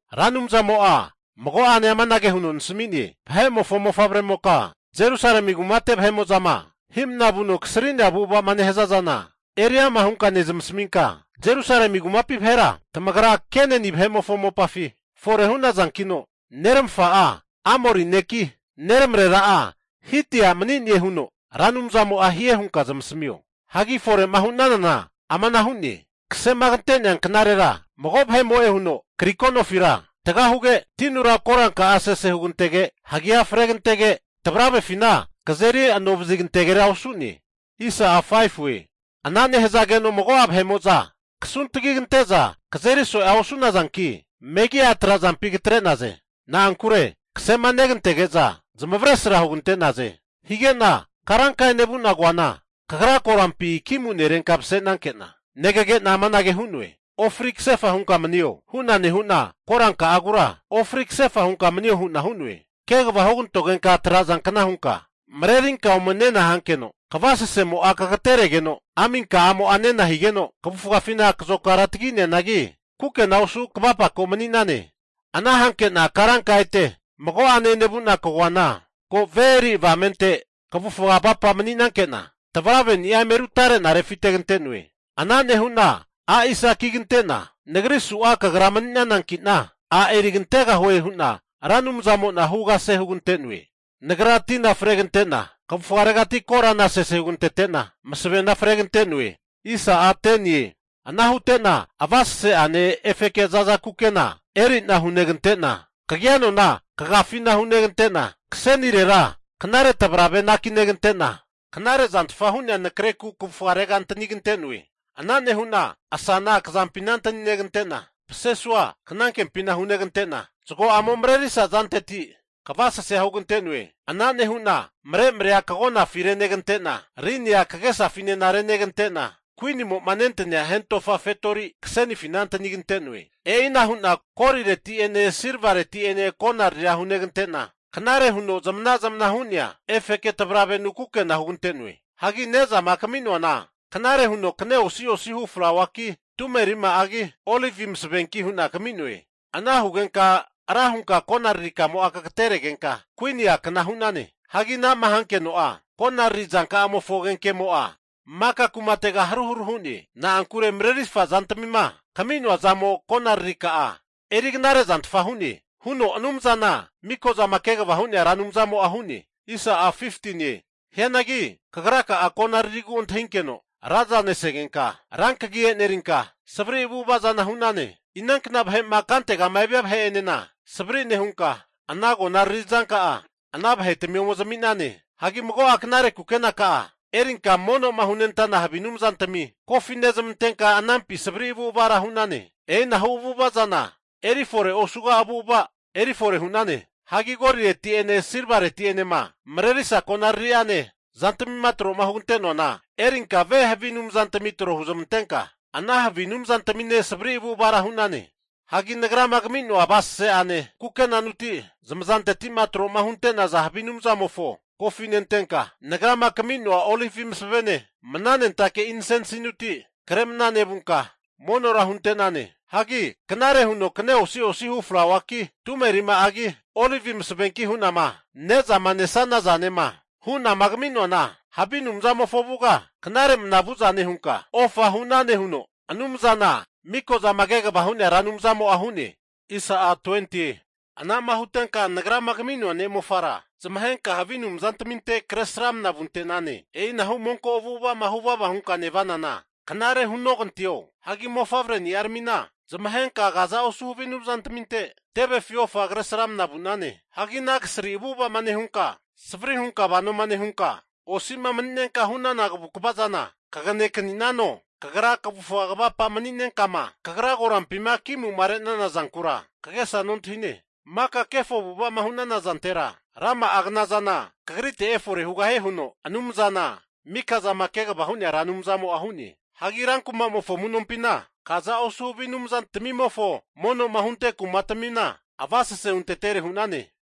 Ra Anumzamo'a mago'ane amanage huno nasmi'ne, Vahe'mofo mofavremoka, Jerusalemi kumate vahe'mo'zama hi'mna vuno kasri'nea avu'ava'ma nehaza zana eri ama hunka nezmasaminka, Jerusalemi kumapi vahera tamagra Kenani vahe'mofo mopafi fore hu'nazankino, neramafa'a Amori neki, neramarera'a Hiti a' mani'ne huno Ra Anumzamo'a hie hunka zamasamio. Hagi fore'ma hu'nanana ama'na hu'ne, kasema kantea knarera mago vahe'mo'e huno kariko nofira taga huge, tinura koranka'a sese hugantege, hagea fregantege, tavravefina kazeri anovazi kantegera osu'ne. Ana nehazageno mago'a vahe'mo'za kasuntagi kante'za kazeri so'ea osu'nazanki, megia trazampi katre'naze. Na'ankure kasema negantege'za zamavaresra hugante'naze. Hige'na karanka enevu'na koana, kagra korampi ki'mu'nerenka mase'nanke'na, negage'na amanage hu'noe, ofri kasefa hunka manio! Hu'na nehu'na koranka'agura, ofri kasefa hunka manio hu'na hu'noe. Kegava hugantogenka trazankna hunka marerinka ome nena hankeno, kavasasemo'a kagateregeno aminka'amo'a nena higeno, kavufafina kazokara tagi'neanagi, kukena osu kavapako mani'nane. Ana hanke'na karanka ete mago'ane enevu'na kagoana, ko ve eri avamente kavufga avapa'ma mani'nankena, tavraveni'a eme rutare'na refitegante'noe. Ana nehu'na, hunagru hugante'na Nagri su'a kagra mani'nanankina, a' erigantegahue hu'na Ra Anumzamo'na hu kase hugante'noe. Nagra tina fregante'na kavufgaretira korana sese hugantete'na, masavena fregante'noe. Ana hute'na avasese'ane efeke zaza kukena eri'na hunegante'na, kagia nona kagafina hunegante'na, kasenirera knare tavrave anakinegente'na, knarezantfa hu'nea nakreku kavufgarera antanigante'noe. Ana nehu'na asana kazampina antani negante'na, pasesua knankempina hunegante'na zago'amo marerisa zanteti kavasasea hugante'noe. Ana nehu'na maremarea kagonafi renegante'na, rinia kagesafinena renegante'na, kuinimo nentania hentofa fetori kasenifina antanigante'noe. E'ina hu'na golireti'ene silvareti'ene konariria hunegante'na, knare huno zamana zamana hu'nea efeke tavravenu kukena hugante'noe. Hagi ne'zama kami'noana knare huno kne osi'osi hu flauaki, tume rima'agi, olivi masavenki hu'na kami'noe. Ana hugenka ra hunka konariri kamo'a kagateregenka kuini a'kna hu'nane. Hagi ana'ma hankeno'a, konariri zanka'amofo agenkemo'a maka kumatega haru haru hu'ne. Na'ankure marerifa zantmima kami'noa zamo konararika'a eri knarezantfa hu'ne, huno Anumzana Mikozama Kegava Hu'nea Ra Anumzamo'a hu'ne. Hianagi kagraka'a konaririgu antahinkeno raza nesegenka, ra kagi e'nerinka savri avu'ava zana hu'nane. Inankna vahe'ma kante'ma evia vahe'enena savri nehunka, ana konariri zanka'a ana vahetami ome zami'nane. Hagi mago'a knare kukenaka'a erinka havi anumzantami kumatami avasasea hunezmantenka anampi savri avu'avara hu'nane. E'inahu avu'ava zana eri fore osuga avu'ava eri fore hu'nane. Hagi golireti'ene silvareti'enema marerisa konariri'ane zantmima tro'ma hugante'noana erinka ve havi anumzantami tro huzmantenka, ana havi anumzantamine savri avu'avara hu'nane. Hagi Nagrama kami'noa avasese'ane kukenanuti zamazantetima tro'ma hunte'naza havi anumzamofo kofinentenka, Nagrama kami'noa olivi masavene mnanentake'za insensinuti kre mna nevunka monora hunentane. Hagi knare huno kne osi'osi hu flauaki, tume rima'agi, olivi masavenki hu'nama ne'zama nesana zanema hu'nama kami'noana, havi anumzamofo avuga knare mna vu'zane hunka ofa hu'nane huno Anumzana miko zama kegava hu'nea Ra Anumzamo'a hu'ne. Ana'ma hutenka Nagrama kami'noa ne'mofara zamahenka havi anumzantaminte kresramna vunte'nane. E'inahu monko avu'ava'ma huvavama hunka nevanana knare hunoganteo? Hagi mofavreni'aramina zamahenka kaza osu havi anumzantaminte tevefi ofa Kresramana vu'nane. Hagi ana kasri avu'ava'ma nehunka, savari hunka vanoma nehunka osi'ma mani'nenkama hu'nana kavukava zana kage kani'nano! Kagra kavufga kavapa'ma mani'nenkama kagra korampi'ma ki'mu'ma re'nana zankura kagesa nontahine. Maka kefo avu'ava'ma hu'nana zantera, rama'a knazana kagritera efore hugahie, huno Anumzana mika'zama kegavama hu'nea Ra Anumzamo'a hu'ne. Hagi rankumamofo amu'nompina kaza osu havi anumzantmimofo mono'ma hunte kumatamina avasese huntetere hu'nane.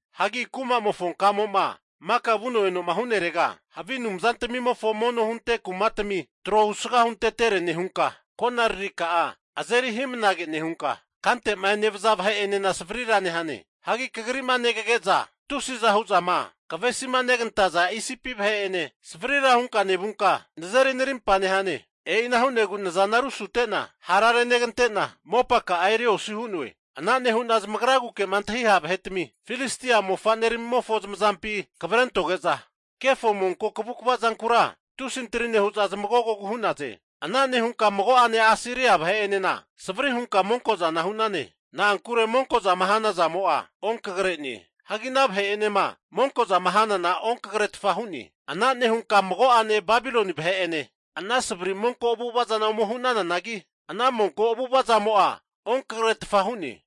Hagi kumamofo kamo'ma maka vuno enoma hu'nerega havi anumzatmimofo mono hunte kumatami tro husga huntetere nehunka, konaririka'a azeri hi'mnage nehunka kante'ma enevaza vahe'enena savarira nehane. Hagi kagri'ma negage'za tusiza hu'zama kavesinegantaza Isipi vahe'ene savrira hunka nevunka, nazeri narimpa nehane. E'ina hu'negu nazana rusute'na hara renegante'na, mopaka'a eri osi hu'noe. Ana nehu'na zamagraguke'ma antahi ha' vahetami, Filistia mofa'neramomofo zamazampi kavrentoge'za, kefo monko kavukva zankura tusi antri nehu'za zamagogogu hu'naze. Ana nehunka mago'ane Asiria vahe'enena savri hunka monko'zana hu'nane. Na'ankure monko zama hana zamo'a onkagare'ne. Hagi ana vahe'enema monkozama hanana onkagaretfa hu'ne. Ana nehunka mago'ane Babiloni vahe'ene ana savri monko avu'ava zana ome hu'nananagi, ana monko avu'ava zamo'a onkagaretfa hu'ne.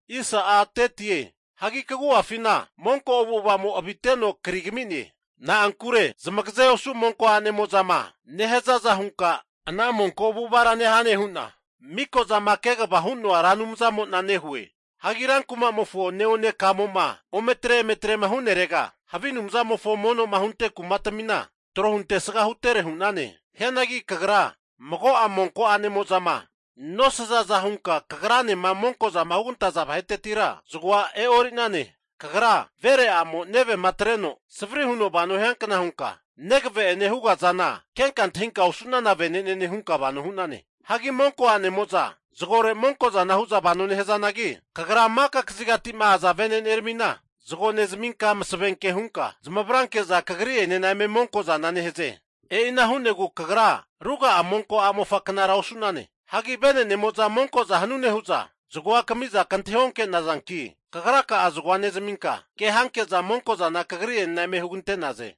Hagi kagu'afina monko avu'avamo aviteno kri kami'ne. Na'ankure zamagaze osu monko anemo'zama nehazaza hunka ana monko avu'avara nehane huna Miko'zama Kegavama Hu'noa Ra Anumzamo'na nehue. Hagi rankumamofo neone kamo'ma ometre emetre'ma hu'nerega havi anumzamofo mono'ma hunte kumatamina tro huntesga huntetere hu'nane. Hianagi kagra mago'a monko a'nemozama nosazaza hunka kagranema monko'zama hugantaza vahetetira zagoa e'ori'nane. Kagra vere a'mo nevema atreno savri huno vano hiankna hunka, negave'ene hugazana kenka antahinka osu'nana vene'nene hunka vano nehane. Hagi monko a'nemo'za zagore monko zana hu'za vano nehazanagi, kagra maka kazigati'ma aza vene'neramina zago nezaminka masave hunka zamavranke'za, kagri'enena eme monkozana nehaze. E'ina hu'negu kagra ruga'a monko a'mofaknara osu'nane. Hagi vene'nemo'za monko'za hanune hu'za zagoa kami'za kantahi onke'nazanki, kagra'a zagoa nezaminka ke hanke'za monko'zana kagri'enena eme hu'naze.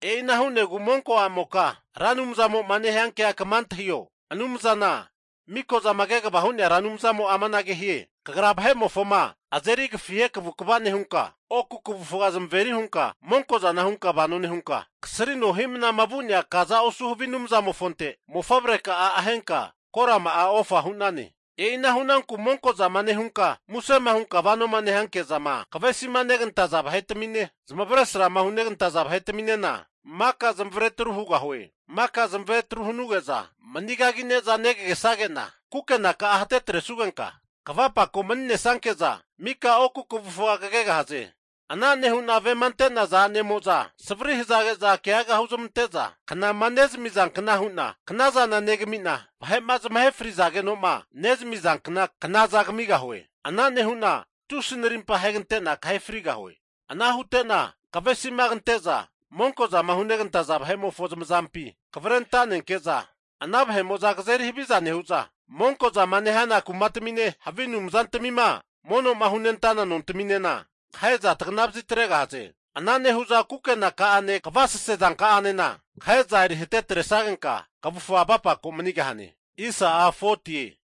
E'ina hu'negu monko a'moka Ra Anumzamo'ma nehiankea kama antahio! Anumzana Mikozama Kegava Hu'nea Ra Anumzamo'a amanage hie, Kagra vahe'mofoma azeri agafihe kavukva nehunka, oku kavufga zamaveri hunka monkozana hunka vano nehunka, kasrino hi'mnama vu'nea kaza osu havi anumzamofonte mofavreka'a ahenka korama'a ofa hunane. E'ina hunanku monkozama nehunka musema hunka vanoma nehanke'zama kavesima negantaza vahe'tamine, zamavaresrama hunegantaza vahetaminena maka zamavare atru hugahue. Maka zamavare atru hanuge'za manigagine'za negagesage'na kukenaka'a hatetresugenka kavufa kavapako mani'nesanke'za mika oku kavufga kegahaze. Ana nehu'na vema ante'naza a'nemo'za savri'ma hazage'za keaga huzmante'za knama nezami'zankna hu'na knazana negami'na, vahe'ma zamahe frizageno'ma nezamizankna knaza kamigahue. Ana nehu'na tusi narimpa ahegante'na kahe frigahue. Ana hute'na kavesima kante'za monko'zama hunegantaza vahe'mofo zamazampi kavre anta'nenke'za, ana vahe'mo'za kazeri haviza nehu'za, monkozama nehana kumatamine, havi anumzantamima mono'ma hunentana nontaminena kahe'za tagana vazitregahaze. Ana nehu'za kukenaka'ane kavasese zanka'anena kahe'za eri hatetresagenka kavufga avapako manigahane.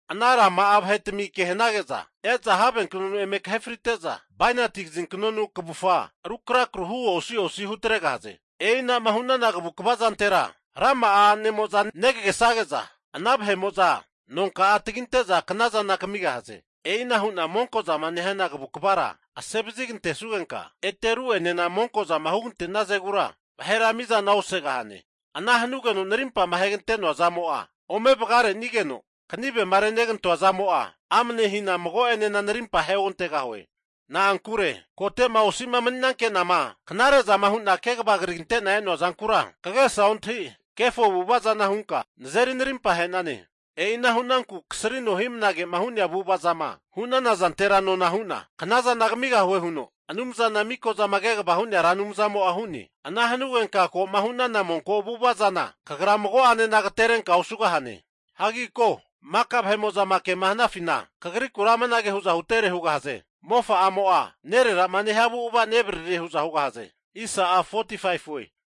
Ana rama'a vahetami ke hanage'za e'za havenknonu eme kahe frite'za, bainati kazinknonu kavufga ru krakru hu osi'osi hutregahaze. E'ina'ma hu'nana kavukva zantera rama'a a'nemo'za negagesage'za, ana vahe'mo'za nonka'a taginte'za knazana kamigahaze. E'ina hu'na monkozama nehana kavukavara asevazi kantesugenka, ete ru'enena monkozama hugante'nazegura vahera mizana osegahane. Ana hanugeno narimpama ahegante'noa zamo'a ome vagarenigeno, kanivema renegantoa zamo'a amne hina mago'enena narimpa aheogantegahue. Na'ankure kote'ma osi'ma mani'nanke'nama knare'zama hu'na kegava krigante'na e'noa zankura kagesa ontahi, kefo avu'ava'zana hunka nazeri narimpa ahe'nane. E'ina hu'nanku kasrino hi'mnagema hu'nea avu'avazama hu'nana zantera nona hu'na knazana kamigahue huno Anumzana Mikozama Kegava Hu'nea Ra Anumzamo'a hu'ne. Ana hanugenka ko'ma hu'nana monko avu'ava zana kagra mago'ane agaterenka osugahane. Hagi ko, maka vahe'mo'za kema hanafina kagrikura amanage hu'za hutere hugahaze, mofa'amo'a nererama nehia avu'ava nevaririe hu'za hugahaze.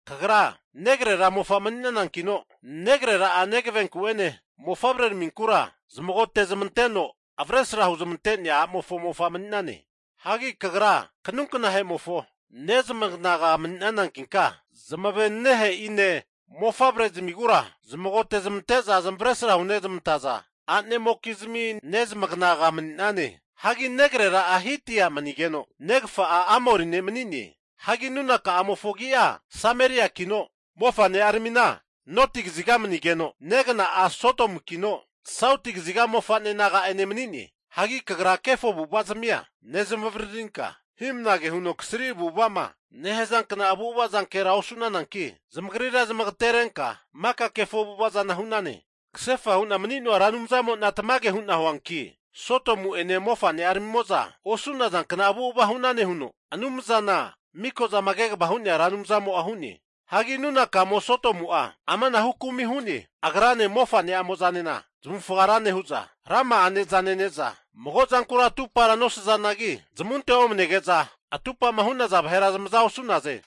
Kagra negrera mofa mani'nanankino, negrera'a nevenku'ene mofavre'araminkura zamagote'zmanteno avresra huzmante'nea a'mofo mofa mani'nane. Hagi kagra kanunknahe'mofo nezmaganaga mani'nanankinka, zamavenenehe'ine mofavre'zmigura zamagote'zmante'za zamavaresra hunezmantaza a'nemokizmi nezmaganaga mani'nane. Hagi negrera'a Hiti a' manigeno negafa'a, Amori ne' mani'ne. Hagi nunakamofo agi'a Sameriakino, mofane'aramine noti kaziga manigeno, negagna'a Sodomukino sauti kaziga mofa'ne naga'ane mani'ne. Hagi kagra kefo avu'avazazmia nezmavaririnka, hi'mnage huno kasri avu'ava'ma nehazankna avu'ava zankera osu'nananki, zamagrira zamagaterenka maka kefo avu'ava zana hu'nane. Kasefa hu'na mani'noa Ra Anumzamo'na tamage hu'na huanki, Sodomu'ene mofane'aramimo'za osu'nazankna avu'ava hu'nane huno, Anumzana miko'zama kegavama hu'nea Ra Anumzamo'a hu'ne. Hagi nunakamo Sodomu'a amanahu kumi hu'ne, agrane mofane'amozanena zamavufaga ra nehu'za, rama'a ne'za nene'za mago zankura atupara nosazanagi, zamunte omnege'za atupama hu'naza vahera zamaza osu'naze.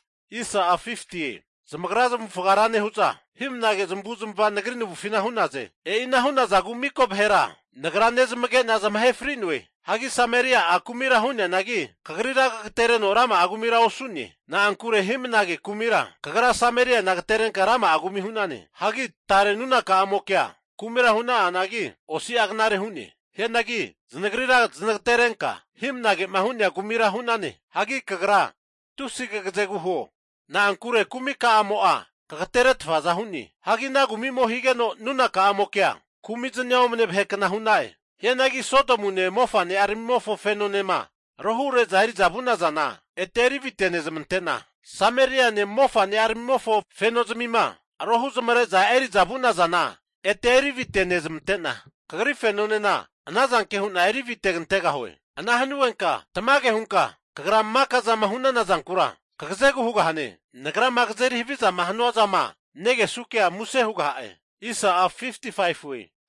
Zamagra zamavufaga ra nehu'za hi'mnage zamavu'zmava Nagri navufina hu'naze. E'ina hu'nazagu mika vahera Nagra nezamage'na zamahe fri'noe. Hagi Sameria'a kumira hu'neanagi, kagrira kagatereno rama'a kumira osu'ne. Na'ankure hi'mnage kumira kagra Sameriana agaterenka rama'a kumi hu'nane. Hagi tare nunaka'amokea kumira hu'na'anagi, osi'a knare hu'ne. Hianagi zanagrira zanagaterenka hi'mnage'ma hu'nea kumira hu'nane. Hagi kagra tusi kagazegu huo, na'ankure kumi ka'amo'a kagateretfaza hu'ne. Hagi ana kumi'mo higeno nunaka'amokea kumi'zani'a omne vahekna hu'na'e. Hianagi Sodomune mofane'aramimofo fenonema rohure'za eri'za vu'nazana, ete eri avite'nezmante'na, Sameriane mofane'aramimofo fenozmima rohu'ma re'zama eri'za vu'nazana ete erivite nezmante'na, kagri fenonena ana zanke hu'na eri avite'gantegahue. Ana hanugenka tamage hunka kagra maka zama hu'nana zankura kagazegu hugahane. Nagrama kazeri havizama hanua zama nunakamokema negesukea muse hugaha'e.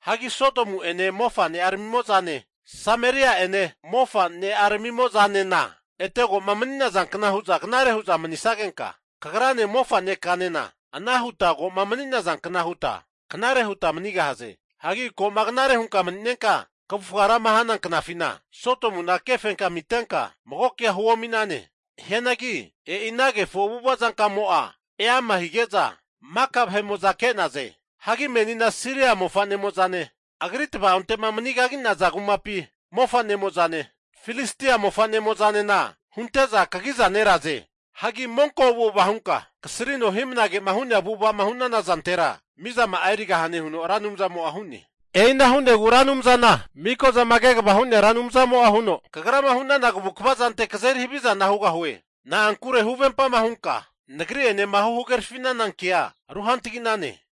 Hagi Sodomu'ene mofane'aramimo'zane, Sameria'ene mofane'aramimo'zanena, ete ko'ma mani'nazankna hu'za knare hu'za manisagenka, kagrane mofanekanena ana huta koma mani'nazankna huta knare huta manigahaze. Hagi ko'ma knare hunka mani'nenka kavufga rama hana knafina, Sodomuna kefenkami atrenka mago kea huomi'nane. Hianangi e'i ana kefo avu'ava zankamo'a eama hige'za maka vahe'mo'za ke'naze. Hagi menina Siria mofa'nemozane, agri tava'ontema manigagi'naza kumapi mofa'nemofozane, Filistia mofa'nemo'zanena hunte'za kagiza neraze. Hagi monko avu'ava'ma hunka kasrino hi'mnagema hu'nea avu'ava'ma hu'nana zantera, mizama'a erigahane huno Ra Anumzamo'a hu'ne. E'ina hu'negu Ra Anumzana miko zama kegava hu'nea Anumzamo'a huno, kagrama hu'nana kavukva zante kazeri havi'zana hugahue. Na'ankure huvempama hunka Nagri'enema huhagerafi'nana kea ruhantagi'nane.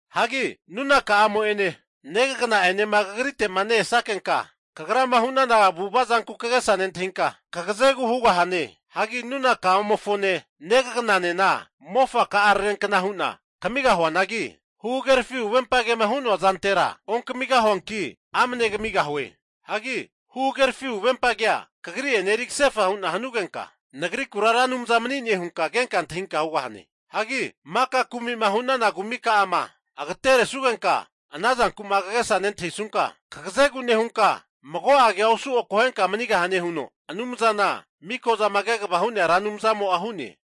Hagi nunaka'amo'ene negagana'enema kagrite'ma ne-esakenka kagrama hu'nana avu'ava zanku kagesa nentahinka kagazegu hugahane. Hagi nunaka'amofone negagananena mofaka'ararenkna hu'na kamigahuanagi, huhagerafi huvempa kema hu'noa zantera onkamigahuanki, amne kamigahue. Hagi huhagerafi huvempa kea kagri'ene eri kasefa hu'na hanugenka, Nagrikura Ra Anumza mani'ne hunka kenka antahinka hugahane. Hagi maka kumi'ma hu'nana kumika'ama atregantesugenka ana zanku'ma kagesama nentahisunka, kagazegu nehunka mago kea osu akohenka manigahane huno Anumzana miko zama kegava hu'nea Ra Anumzamo'a hu'ne.